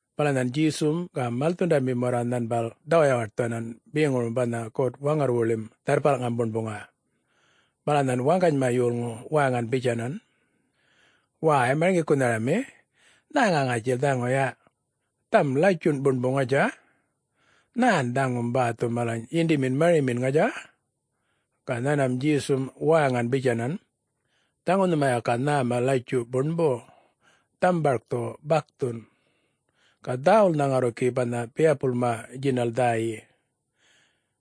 Bala nhan Djesum ga malthundamim warra nhanbal dhawayawaṯthuwanan beŋurum banha God-Waŋarrwuḻim Dharrpalꞌŋam Buṉbuŋa. Bala nhan waŋganyma yolŋu wäŋan bitjanan, “Wäy Marŋgikunharami, nhäŋa ŋatjil dhaŋu yaꞌ, dhaŋum latjunꞌ buṉbu ŋatja? Nhän dhaŋum bäthu malany yinḏimin marimin, ŋatja?” Ga nhanmam Djesum wäŋan bitjanan, “Dhaŋu nhuma yaka nhäma latjuꞌ buṉbu, dhaŋum barkthu bakthun. Ga dhäwulnha ŋarru gi banha biyapulma djinal dhäyi.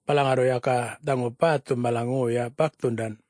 Bala ŋarru yaka dhaŋu bäthum mala ŋoya bakthundan.”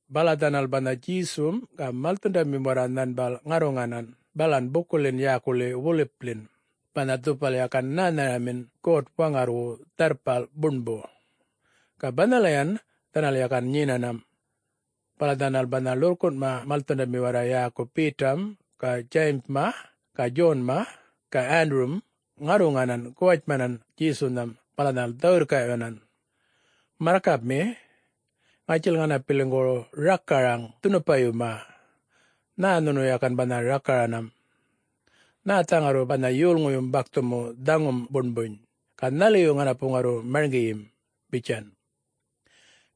Bala dhanal banha Djesum ga malthundamim warra nhanbal ŋarruŋanan balan bukuḻin yäkuḻi Wolipḻin banha dhupal yakan nhänharamin God-Waŋarrwu Dharrpal Buṉbu, ga banhalayan dhanal yakan nyenanam. Bala dhanal banha ḻurrkunꞌma malthundami warra yäku Betam ga Djayimma ga Djonma ga Wandurum ŋarruŋanan guwatjmanan Djesunhan bala dhanal dhä-wirrkaꞌyuwanan, “Marrkapmi, ŋatjil ŋanapiliŋgu rakaraŋ dhunupayuma, nhä nhunu yakan banha rakaranam. Nhätha ŋarru banha yolŋuyum bakthumu dhaŋum buṉbuny, ga nhaliyu ŋanapu ŋarru marŋgiyim?” bitjan.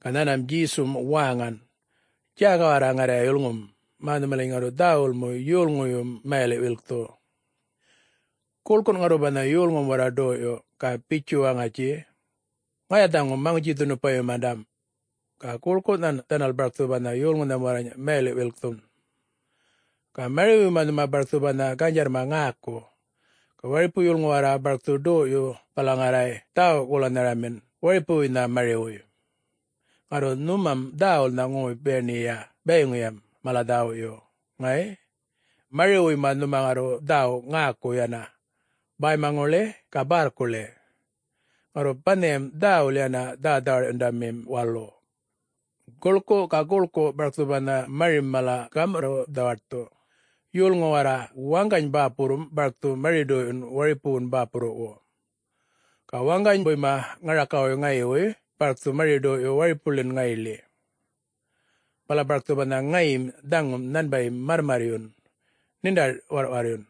Ga nhanmam Djesum wäŋan, “Djäga warra ŋarrya yulŋum, mä nhumaliny ŋarru dhäwul mu yolŋuyum mayaliꞌ-wilkthu. Guḻkun ŋarru banha yolŋum warra ḏoyꞌyu, ga bitjun waŋatji, ‘Ŋaya dhaŋu Maŋutji-dhunupayumandam,’ ga guḻkunhan dhanal barkthu banha yolŋunham warrany mayaliꞌ-wilkthun. Ga mariwuyma nhuma barkthu banha ganydjarrma ŋäku. Ga waripu yolŋu warra barkthu ḏoyꞌyu bala ŋarruŋay dhäwu-golanharamin waripuwuynha mariwuy. Ŋarru nhumam dhäwulnha ŋoy-buṉakiya bayiŋuyam mala dhäwuyu, ŋay? Mariwuyma nhuma ŋarru dhäwu ŋäku yana, bäymaŋuḻi ga bärrkuḻi, ŋarru banhayam dhäwul yana dhä-dhawarꞌyundamim walu. Guḻku ga guḻku barkthu banha marim malany gamurruꞌ-dhawaṯthu. Yolŋu warra waŋgany bäpurrum barkthu mari-ḏoyꞌyun waripuŋuwun bäpurruwu. Ga waŋganybuyma ŋarakawuy ŋayiwuy barkthu mari-ḏoyꞌyu waripuŋuḻin ŋayiḻi. Bala barkthu banha ŋayim dhaŋum nhanbayim marrmarryun, ṉiṉḏa-warrꞌwarryun.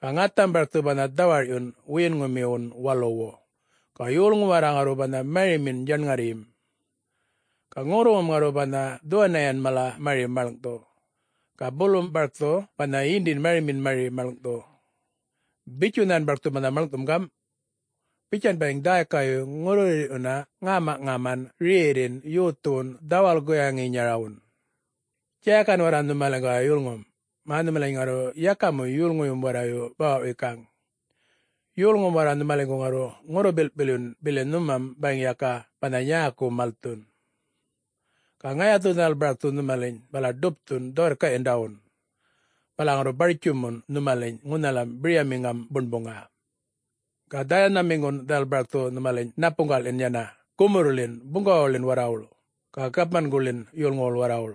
Ga ŋatham barkthu banha dhawarꞌyun wiyiŋumiwun waluwu, ga yolŋum warra ŋarru banha marimin djaṉŋarryim. Ga ŋurruŋum ŋarru banha dhuwaniyan mala mari maḻŋꞌthu, ga bulum barkthu banha yinḏin marimin mari maḻŋꞌthu. Bitju nhan barkthu banha maḻŋꞌthum gamꞌ: Bitjan bayiŋ dhäykayu ŋurruyirrꞌyuna ŋämaꞌŋaman rerrin yothuwun dhäwal-guyaŋinyarawun. Djägan warra nhumaliŋguway yulŋum, mä nhumaliny ŋarru yaka mu yolŋuyum warrayu bawaꞌ-wikaŋ. Yolŋum warra nhumaliŋgu ŋarru ŋurru-bilꞌpilyun bili nhumam bayiŋ yaka banha nyäku malthun. Ga ŋayathu dhanal barkthu nhumaliny bala ḏupthun dhä-wirrkaꞌyandawun, bala ŋarru bartjumun nhumaliny ŋunhalam biryamiŋam buṉbuŋa. Ga dhäyanhamiŋgun dhanal barkthu nhumaliny ṉapuŋgaḻin yana gumurrḻin buŋgawawuḻin warrawuḻ ga gapmanguḻin yolŋuwuḻ warrawul.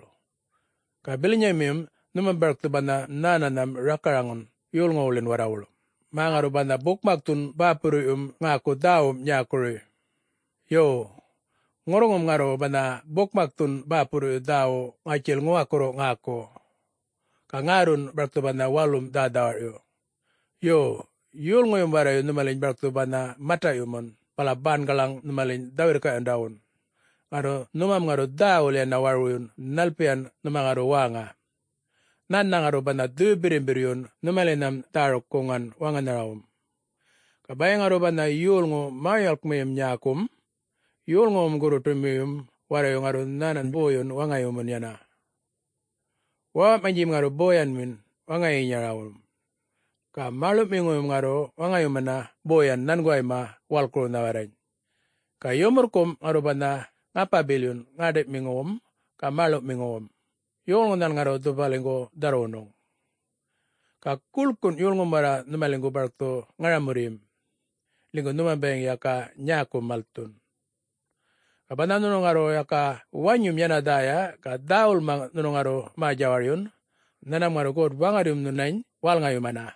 Ga bilanyamiyum nhunum barkthu banha nhänanham rakaraŋun yolŋuwuḻin warrawuḻ, mä ŋarru banha bukmakthun bäpurruꞌyum ŋäku dhäwum nyäkuruwuy. Yo, ŋurruŋum ŋarru banha bukmakthum bäpurruyu dhäwu ŋätjil ŋuwakurru ŋäku, ga ŋärrun barkthu banha walum dhä-dhawarꞌyu. Yo, yolŋuyum warrayu nhumaliny barkthu banha mataꞌyumun bala bangalaŋ nhumaliny dhä-wirrkaꞌyundawun, ŋarru nhumam ŋarru dhäwul yana warwuyun nhalpiyan nhuma ŋarru wäŋa. Nhännha ŋarru banha Dhuyu-Birrimbirryun nhumalinham dhäruk-guŋan wäŋanharawum. Ga bayiŋ ŋarru banha yolŋu mä-yuwalkmiyi nyäkum, yolŋuyum gurruṯumiyum warrayu ŋarru nhanany boyun waŋayumun yana. Wäwaꞌmanydjim ŋarru boyanmi waŋayinyarawun. Ga mäḻuꞌmiŋuyum ŋarru waŋayumun boyu nhanguwayma walkurnha warrany. Ga yumurrkumꞌ ŋarru banha ŋapa-bilyun ŋäṉḏiꞌmiŋuwum ga mäḻuꞌmiŋuwum, yolŋunhan ŋarru dhupaliŋgu dharrwunuŋ. Ga guḻkun yolŋum warra nhumaliŋgu barkthu ŋaramurryim, ḻinygu nhuma bayiŋ yaka nyäku malthun. Ga banha nhunu ŋarru yaka wanyum yana dhäya ga dhäwulma nhunu ŋarru mä-djawaryun, nhanmam ŋarru God-Waŋarryum nhunany wälŋayumana.”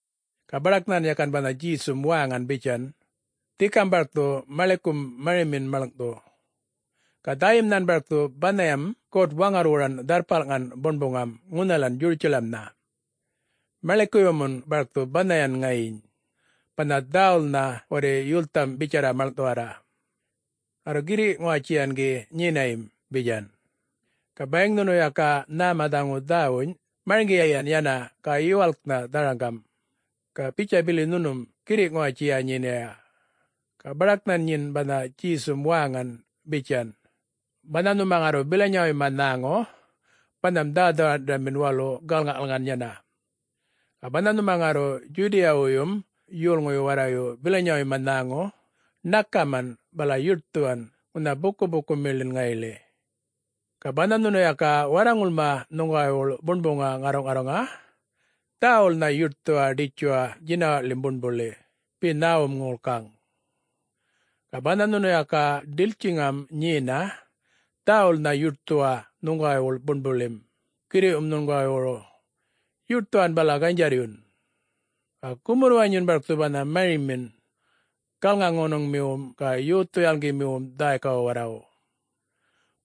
Ga baḏak nhan yakan banha Djesum wäŋan bitjan, “Dhikam barkthu maḻikun marimin maḻŋꞌthu. Ga dhäyim nhan barkthu banhayam God-Waŋarrwuran Dharrpalŋan Buṉbuŋam ŋunhal Djurutjalamnha, maḻikuyumun barkthu banhayan ŋayiny, banha dhäwulnha warri yultham bitjarra maḻŋꞌthuwarra. Ŋarru, girriꞌ-ŋuwatjiyan ki nyiniyam,” bitjan. (Ga bayiŋ nhunu yaka nhäma dhaŋu dhäwuny, marŋgiyiyan yana ga yuwalknha dharaŋgam, ga bitja bili nhunum girriꞌ-ŋuwatjiya nyiniya.) Ga baḏak nhan nyin banha Djesum wäŋan bitjan, “Banha nhuma ŋarru bilanyawuyma nhäŋu, banham dhä-dhawarꞌyundamim walu galŋaꞌkalŋan yana. Ga banha nhumam ŋarru Djudiyawuyyum yolŋuyu warrayu bilanyawuyma nhäŋu, ṉakaman bala yuṯthuwan ŋunha bukuꞌpukumiḻin ŋayiḻi. Ga banha nhunu yaka warraŋulma nhuŋguwaywuḻ buṉbuŋa ŋarruꞌŋarruŋa, dhäwulnha yuṯthuwa ḏitjuwa djinawaꞌḻim buṉbuḻi be nhäwum ŋolkaŋ. Ga banha nhunu yaka ḏiltjiŋam nyena, dhäwulnha yuṯthuwa nhuŋguwaywuḻ buṉbuḻim girriꞌwum nhuŋguwaywuru, yuṯthuwan bala ganydjarryun. Ga gumurr-wanyun barkthu banha marimin galŋa-ŋonuŋmiwum ga yothu-yalŋgimiwum dhäykawu warrawu.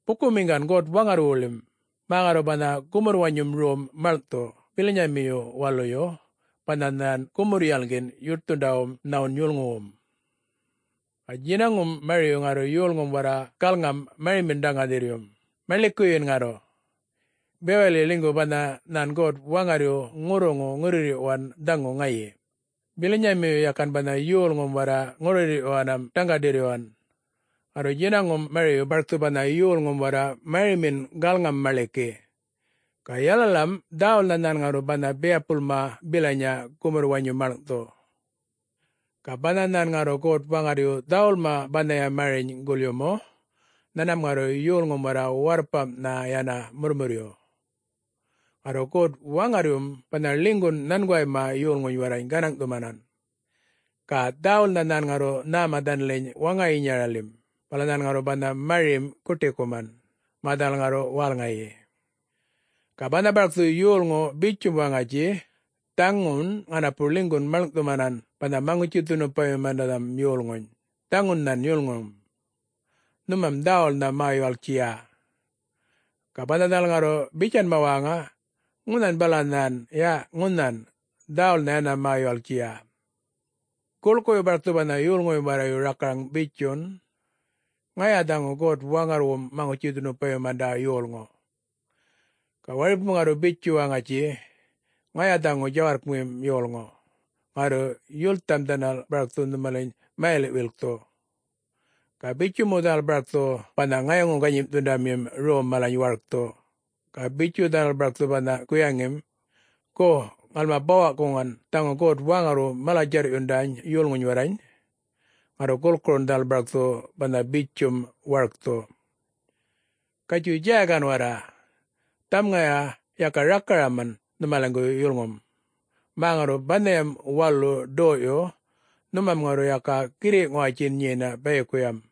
Bukumiŋgan God-Waŋarrwuḻim, mä ŋarru banha gumurr-wanyum rom maḻŋꞌthu bilanyamiyu waluyu, banha nhan gumurr-yalŋgin yuṯthundawum nhawun yolŋuwum. Ga djinaŋum mariyu ŋarru yolŋum warra galŋam-marimin dhaŋga-ḏirryum, maḻikuyin ŋarru. Bewaḻi ḻinygu banha nhan God-Waŋarryu ŋurruŋu ŋurruyirrꞌyuwan dhaŋu ŋayi, bilanymiyu yakan banha yolŋum warra ŋurruyirrꞌyuwanam dhaŋga-ḏirryuwan. Ŋarru djinaŋum mariyu barkthu banha yolŋum warra marimin galŋam-maḻiki. Ga yalalam dhäwulnha nhan ŋarru banha biyapulma bilanya gumurr-wanyu maḻŋꞌthu. Ga banha nhan ŋarru God-Waŋarryu dhäwulma banhaya mariny gulyumu, nhanmam ŋarru yolŋum warra warrpamꞌnha yana murrmurryu. Ŋarru God-Waŋarryum banha ḻinygun nhanguwayma yolŋuny warrany gänaŋꞌthumanan, ga dhäwulnha nhan ŋarru nhäma dhanaliny waŋayinyaḻim, bala nhan ŋarru banha marim guṯikuman, mä dhanal ŋarru wälŋayi. Ga banha barkthu yolŋu bitjum waŋatji, ‘Dhaŋun ŋanapu ḻinygun maḻŋꞌthumanan banha Maŋutji-dhunupayumandanham yolŋuny, dhaŋun nhan yulŋum.’ Nhumam dhäwulnha mä-yuwalktjiya. Ga banha dhanal ŋarru bitjanma wäŋa, ‘Ŋunhan bala nhan, ya ŋunhan,’ dhäwul yana mä-yuwalktjiya. Guḻkuyu barkthu banha yolŋuyum warrayu rakaraŋ bitjun, “Ŋaya dhaŋu God-Waŋarrwuŋum Maŋutji-dhunupayumanda yolŋu.” Ga waripum ŋarru bitju waŋatji, “Ŋaya dhaŋu djawarrkmim yolŋu,” ŋarru yultham dhanal barkthu nhumaliny mayaliꞌ-wilkthu, ga bitju mu dhanal barkthu banha ŋayaŋu-ganyimꞌthundamim rom malany warkthu. Ga bitju dhanal barkthu banha guyaŋim, ‘Gu, ŋalma bawa-guŋan dhaŋu God-Waŋarrwu mala-djarrꞌyundany yolŋuny warrany.’ Ŋarru gulkurun dhanal barkthu banha bitjum warkthu. Gatjuy djägan warra! Dhaŋum ŋaya yaka rakaraman nhumaliŋgu yulŋum, mä ŋarru banhayam walu ḏoyꞌyu, nhumam ŋarru yaka girriꞌ-ŋuwatjin nyena bayikuyam.”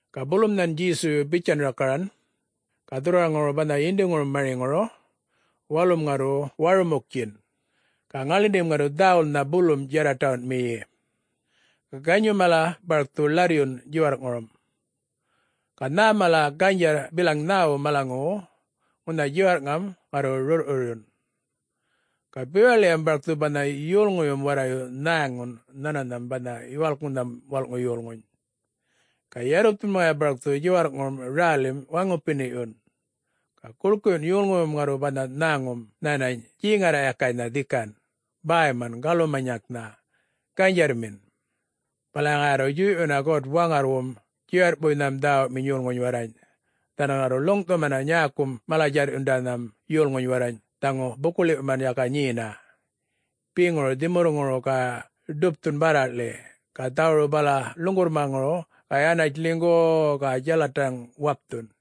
Ga bulum nhan Djesuyu bitjanan rakaran, “Ga dhurrwaraŋuru banha yindiŋurum mariŋuru, ‘walum ŋarru warumuktjan, ga ŋaḻindim ŋarru dhäwulnha bulum djarraṯawunmiyi. Ga ganyum mala barkthu ḻarryun djiwarrꞌŋurum, ga nhä mala ganydjarr bilaŋ nhäwu malaŋuwu ŋunha djiwarrꞌŋam ŋarru rurrꞌrurryun.’ Ga bewaḻiyam barkthu banha yolŋuyum warrayu nhäŋun nhänanham banha Yuwalknham Walꞌŋu Yolŋuny. Ga yarrupthum ŋaya barkthu djiwarrꞌŋurum rälim waŋupiniꞌyun. Ga guḻkuyun yolŋuyum ŋarru banha nhäŋum nhänany djeŋarraꞌyakaynha dhikan, bäyman galumanyaŋnha, ganydjarrmin. Bala ŋaya ŋarru djuyꞌyuna God-Waŋarrwum djiwarrꞌpuynham dhäwuminy yolŋuny warrany, dhanal ŋarru ḻuŋꞌthumana nyäkum mala-djarrꞌyundanham yolŋuny warrany dhaŋu buku-ḻiwꞌyuman yaka nyena, beŋuru dhimurruŋuru ga ḏupthun bärraꞌḻi ga dhawuru bala ḻuŋgurrmaŋuru ga yanatj ḻinygu-u-u ga djalathaŋ wapthun.”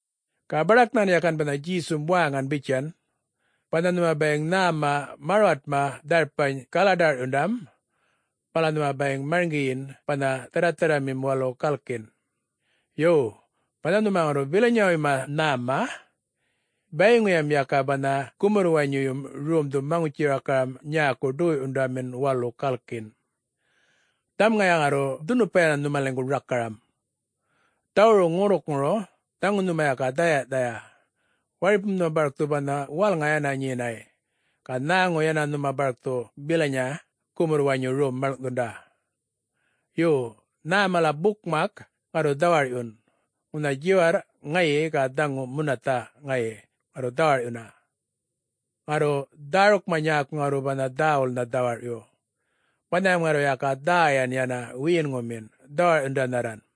Ga baḏak nhan yakan banha Djesum wäŋan bitjan, “Banha nhuma bayiŋ nhäma marwatma dharpany galadarꞌyundam, bala nhuma bayiŋ marŋgiyin banha dharratharramim walu galkin, Yo, banha nhuma ŋarru bilanyawuyma nhäma, bayiŋuyam yaka banha gumurr-wanyuyum romdhu maŋutji-rakaram nyäku ḏoyꞌyundamim walu galkin. Dhaŋum ŋaya ŋarru dhunupa yana nhumaliŋgu rakaram! Dhawuru ŋurrukŋuru, dhaŋu nhuma yaka dhäyaꞌthaya, waripum nhuma barkthu banha wälŋa yana nyenay, ga nhäŋu yana nhuma barkthu bilanya gumurr-wanyum rom malŋꞌthunda. Yo! Nhä mala bukmakma ŋarru dhawarꞌyun, ŋunha djiwarrꞌ ŋayi ga dhaŋu munathaꞌ ŋayi ŋarru dhawarꞌyuna. Ŋarru dhärukma nyäku ŋarru banha dhäwulnha dhawarꞌyu, banhayam ŋarru yaka dhäyan yana wiyinŋumin, dhawarꞌyundanharran.”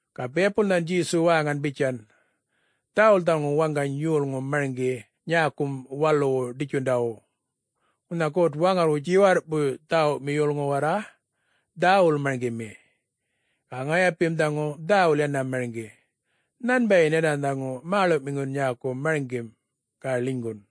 Ga biyapul nhan Djesu wäŋan bitjan, “Dhäwul dhaŋu waŋgany yolŋu marŋgi nyäkum waluwu ḏitjundawu. Ŋunha God-Waŋarrwu djiwarrꞌwuy dhäwumi yolŋu warra dhäwul marŋgimi. Ga ŋayapim dhaŋu dhäwul yana marŋgi. Nhanbayin yana dhaŋu mäḻuꞌmiŋun nyäku marŋgim, ga ḻinygun.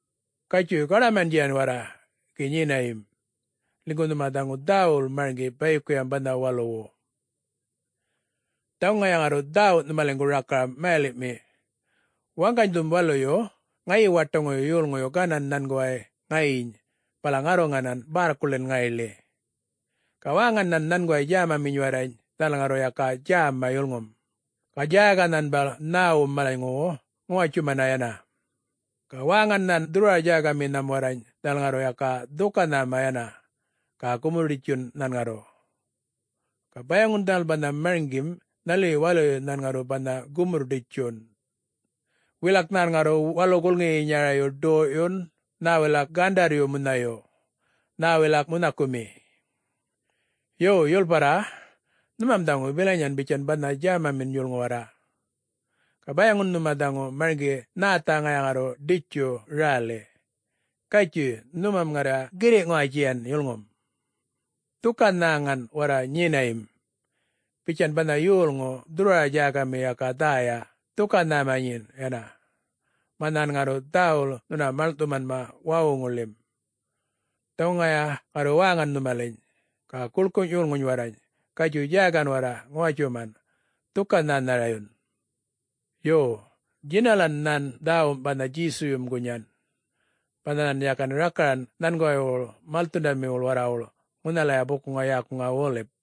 Gatjuy, gaḏamandjiya warra gi nyinayim, ḻinygu nhuma dhaŋu dhäwul marŋgi bayikuyam banha waluwu. Dhaŋu ŋaya ŋarru dhäwu nhumaliŋgu rakaram mayaliꞌmi: Waŋganydhum waluyu ŋayi-waṯaŋuyu yolŋuyu ganan nhanguway ŋayiny bala ŋarruŋanan bärrkuḻin ŋayiḻi. Ga wäŋan nhan nhanguway djämaminy warrany, dhanal ŋarru yaka djäma yulŋum, ga djäga nhanbal nhäwum malanyŋuwu ŋuwatjuman yana. Ga wäŋan nhan dhurrwara-djägaminham warrany dhanal ŋarru yaka dhuka-nhäma yana, ga gumurr-ḏitjun nhan ŋarru. Ga bayaŋun dhanal banha marŋgim nhaliyu waluyu nhan ŋarru banha gumurr-ḏitjun. Wilak nhan ŋarru walu gulŋiyinyarayu ḏoyꞌyun nhä wilak gandarryu munhayu, nhä wilak munhakumi. Yo, yulparra, nhumam dhaŋu bilanyayan bitjan banha djämamin yolŋu warra, ga bayaŋun nhuma dhaŋu marŋgi nhätha ŋaya ŋarru ḏitju räli. Gatjuy, nhumam ŋarrya girriꞌ-ŋuwatjiyan yulŋum. Dhuka-nhäŋan warra nyiniyam, bitjan banha yolŋu dhurrwara-djägami yaka dhäya dhuka-nhäma nyin yana, mä nhan ŋarru dhäwul nhuna maḻŋꞌthuman wawuŋuḻim. Dhaŋu ŋaya ŋarru wäŋan nhumaliny, ga guḻkuny yolŋuny warrany, ‘Gatjuy djägam warra ŋuwatjuman, dhuka-nhänharayun.’” [Yo, djinalan nhan dhäwum banha Djesuyum gunyan, banha nhan yakan rakaran nhanguwaywu malthundamiwu warrawu ŋunhalaya bukuŋa yäkuŋa Wolip.]